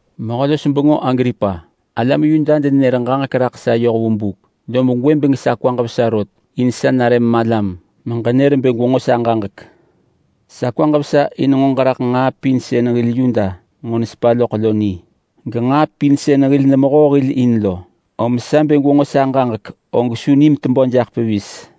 “Mehö-los-bengö Agripa! Alam Yuda denenër ġaġek raḳ sa yoh vu buk, lob gwëbeng sa kwaġ vesa rot in sa nare malam meġenër bë gwenġo sa ġaġek. Sa kwaġ vesa in nġo ġeraḳ nġaa pin sën hil Yuda nġo nesepa loḳ lo ni, genġaa pin sën hil nemehoo hil in lo. Om sa bë gwenġo sa ġaġek, og su nim tebö jaḳ pevis.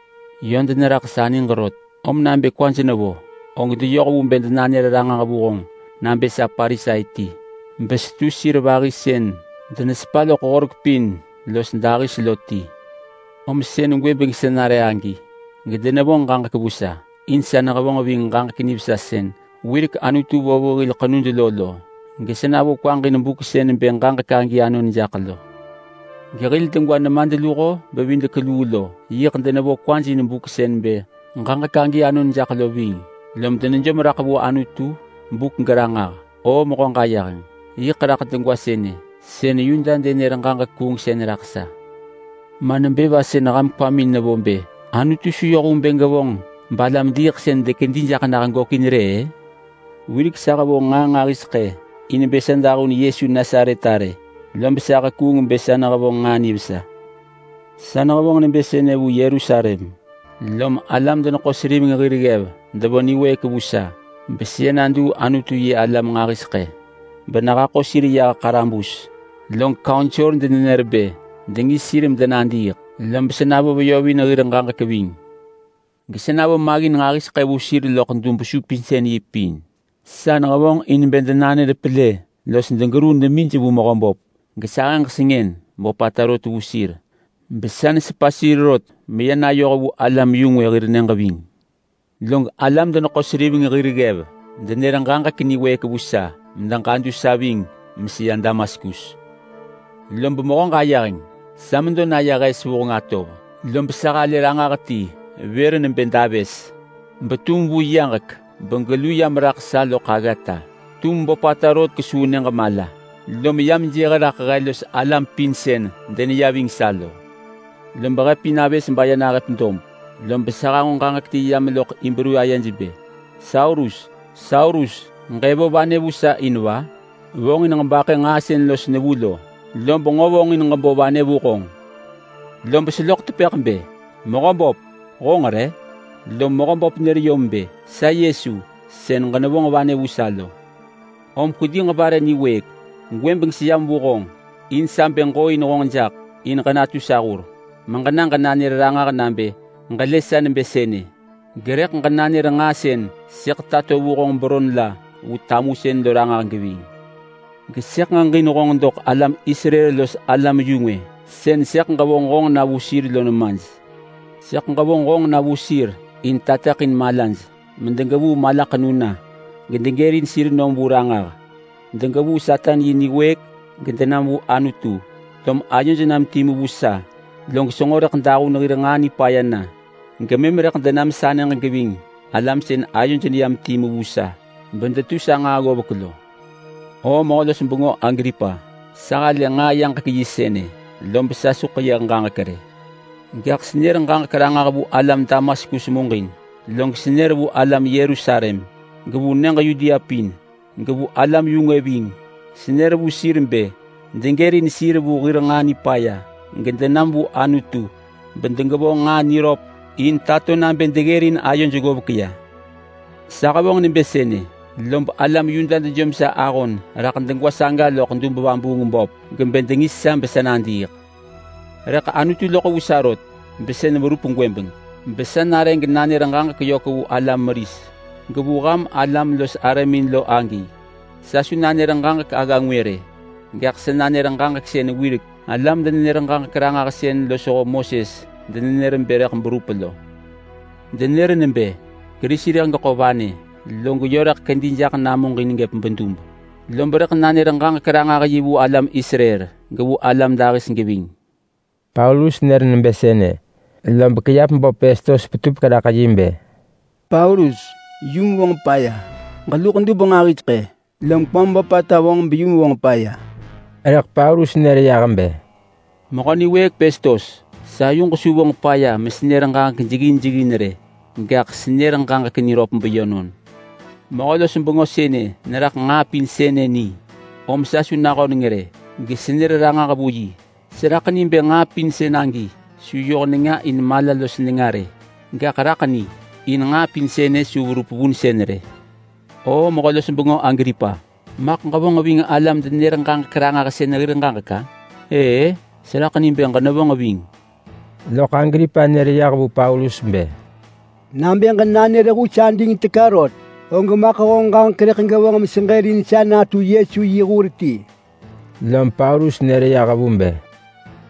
Yö deneraḳ sa niġ rot, om nabë kwaj nevo, og deyoh vu bë denanër ranġah vu honġ nabë sa Parisai ti, besetu sir vahi sën denesepa loḳ horek pin los dahis lo ti. Om sën gwëbeng sa nare agi, gedenevonġ ġaġek vu sa in sa nehevonġ ving ġaġek nivesa sën wirek Anutu vo vu hil ḳenud lo lo, gesa navo kwaġ in buk sën bë ġaġek agi anon jaḳ lo. Gehil degwa nemadluho-bevidek-luu lo yiḳ denevo kwaj in buk sën bë ġaġek agi anon jaḳ lo ving, lom denejom raḳ vu Anutu buk geranġah. O Mehö Ġayeheng, yiḳ raḳ degwa sënë sën Yuda denër ġaġek kuungsën raḳ sa. Ma nebë va sën ham kwamin nevo bë Anutu su yoh vu bë gevonġ balam-diiḳsën dekedi jaḳ nah gökin rë-ë? Wirek sa hevonġ nġaa nġahiseḳë in bë sa dahun Yesu Nasaret arë, lob sa hekuung bë sa nehevonġ nġaa nivesa. Sa nehevonġ nebë sënë vu Yerusalem, lom alam-deneḳo-seriveng hir ggev devo niwëëk vu sa beseya naduu Anutu-yi-alam nġahiseḳë benehaḳo yah ḳarabus. Log kaunsor denenër bë dengis sir medenadiiḳ, lob sa navo veyovin hir ġaġek ving. Gesa navo maggin nġahiseḳë vu sir loḳ dub-supinsën-yi pin. Sa nehevonġ in bë denanër pelë los degeruu demij vu Mehöböp, gesahëġ sengën böpata rot vu sir besa nesepa sir rot meya nayoh vu alam-yu-ngwë hir nyëġ ving.” “Log alam-deneḳo-seriveng hir ggev denër ġaġek niwëëk vu sa medeġadu sa ving meseya Damaskus. Lob Mehö Ġayeheng! Sa medo naya raḳ hes vuheng atov, lob sa halë ranġah ti vër nebë davës betum vu yaġek begelu yam raḳ sa loḳ aggata. Tum böpata rot kesuu nyëġ mala, lom yam jëh raḳ he los alam pin sën deneya ving sa lo. Lob he pin avës baya nahëp dob, lob sa hanġo ġaġek ti yam loḳ Hibru ayej bë, ‘Saulus, Saulus ġëvo vanë vu sa in va? Vonġin ġebaḳë nġaa sën los nevu lo, lob nġo vonġin ġebo vanë vu honġ.’ Lob seloḳ tepëḳ bë, ‘Mehöböp, honġ re?’ Lom Mehöböp nër yom bë, ‘Sa Yesu sën ġenevonġ vanë vu sa lo! Om kwedi ġebare niwëëk. Gwëbeng seyam vu honġ in sa bë ġooin honġ jaḳ in ġenatu sa hur meġena ġenanër ranġah nabë ġelë sa nebë sënë. Gerëḳ ġenanër nġaa sën sëḳ tato vu honġ beron la vu tamusën lo ranġah geving. Gesëḳ ġeġin honġ doḳ alam Israel los alam-yu-ngwë sën sëḳ ġevonġ honġ na vu sir lo nemaj. Sëḳ ġevonġ honġ na vu sir in tateḳin malaj medegevuu malaḳenu na gedegërin sir nom vu ranġah. Degevuu Satan yi niwëëk gedenam vu Anutu, lom ayoj nam timu vu sa, log senġo rëḳ dahun hir nġaa nipaya na. Gemëm rëḳ denam sa nyëġ geving alam sën ayoj neyam timu vu sa bedetu sa nġaa ggovek lo.’” “O Mehö-los-bengö Agripa, sa halë nġaa yaġek yi sënë, lob sa su ḳeyëh ġaġek rë. Gaḳ senër ġaġek ranġah vu alam Damaskus muġin, log senër vu alam Yerusalem, gevu nyëġ Yudea pin, gevu alam-yu-ngwë ving. Senër vu sir bë degërin sir vu hir nġaa nipaya gedenam vu Anutu, bedegevonġ nġaa niröp in tato nabë deggërin ayoj ggovek ya. Sa hevonġ nebë sënë, lob alam Yuda dejom sa ahon raḳ degwa saga loḳ dub-vabuung-böp, gebë dengis sa besa nadiiḳ. Rëḳ Anutu loḳ vu sa, rot besën verup gwëbeng besa nare genanër ġaġek yök vu alam meris, gevu ham alam los arëmin lo agi. Sa su nanër ġaġek agga ngwë rë, gaḳ sa nanër ġaġek sën wirek alam-denenër-ġaġek-ranġahsën losho Moses denenër bë rëḳ berup lo. Denër nebë, ‘Kerisi rëḳ geḳo vanë, log yö rëḳ kedi jaḳ namuġin gëp bedub. Lob rëḳ nanër ġaġek-ranġah-yi vu alam Israel, gevu alam dahis geving.’” Paulus nër nebë sënë, lob kiap böp Pestos petupek raḳ yi bë, “Paulus, honġ bado! Ġeluḳ dub nġahiseḳë, lom kwam böpata vonġ beyum vonġ paya!” Rëḳ Paulus nër yah bë, “Mehö niwëëk Pestos, sa yuġ su vonġ paya mesenër ġaġek jeggin jeggin rë, gaḳ senër ġaġek niröp beyönon. Mehö-los-bengö sënë neraḳ nġaa pin sënë ni, om sa su nahöneng rë gesenër ranġah vu yi. Seraḳ ni bë nġaa pin sën agi su yoh nenga in mala los nenga rë. Gaḳ raḳ ni, in nġaa pin sënë su verup vunsën rë. O Mehö-los-bengö Agripa, maḳ ġevonġ ving alam-denenër-ġaġek-ranġahsën hir ġaġek-a? Ëë-ë, seraḳ ni bë ġenevonġ ving!” Loḳ Agripa nër yah vu Paulus bë, “Nabë ġenanër hus ading teka rot og maḳ honġ ġaġek rëḳ gevonġ meseġërin sa natu Yesu yi hur ti!” Lom Paulus nër yah vu bë,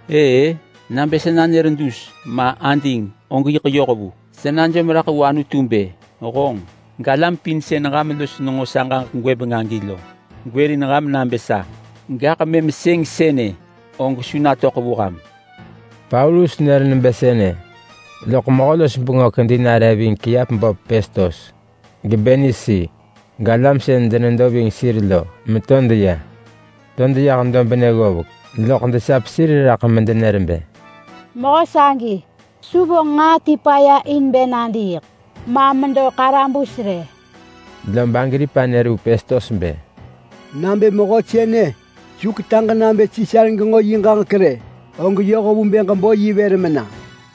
“Ëë-ë! Nabë sa nanër dus, ma ading, og yiḳ yoh vu! Sa najom raḳ vu Anutu bë, honġ, galam pin sën ham los nenġo sa ġaġek gwëbeng-ë lo gwërin ham nabë sa, gaḳ mëm sëng sënë og su natöḳ vu ham.” Paulus nër nebë sënë, loḳ mehö-los-bengö kedi nare ving kiap böp Pestos, geBernisi, galam sën denedo ving sir lo meto deya. To deyah dobnë ggovek, loḳ desap sir raḳ medenër bë, “Mehö sagi su vonġ nġaa ti paya in bë nadiiḳ ma medo ḳarabus rë.” Lob Agripa nër vu Pestos bë, “Nabë mehö sënë su ketaġ nabë Sisar genġo yi ġaġek rë, og yoh vu bë ġebo yi vër mena.”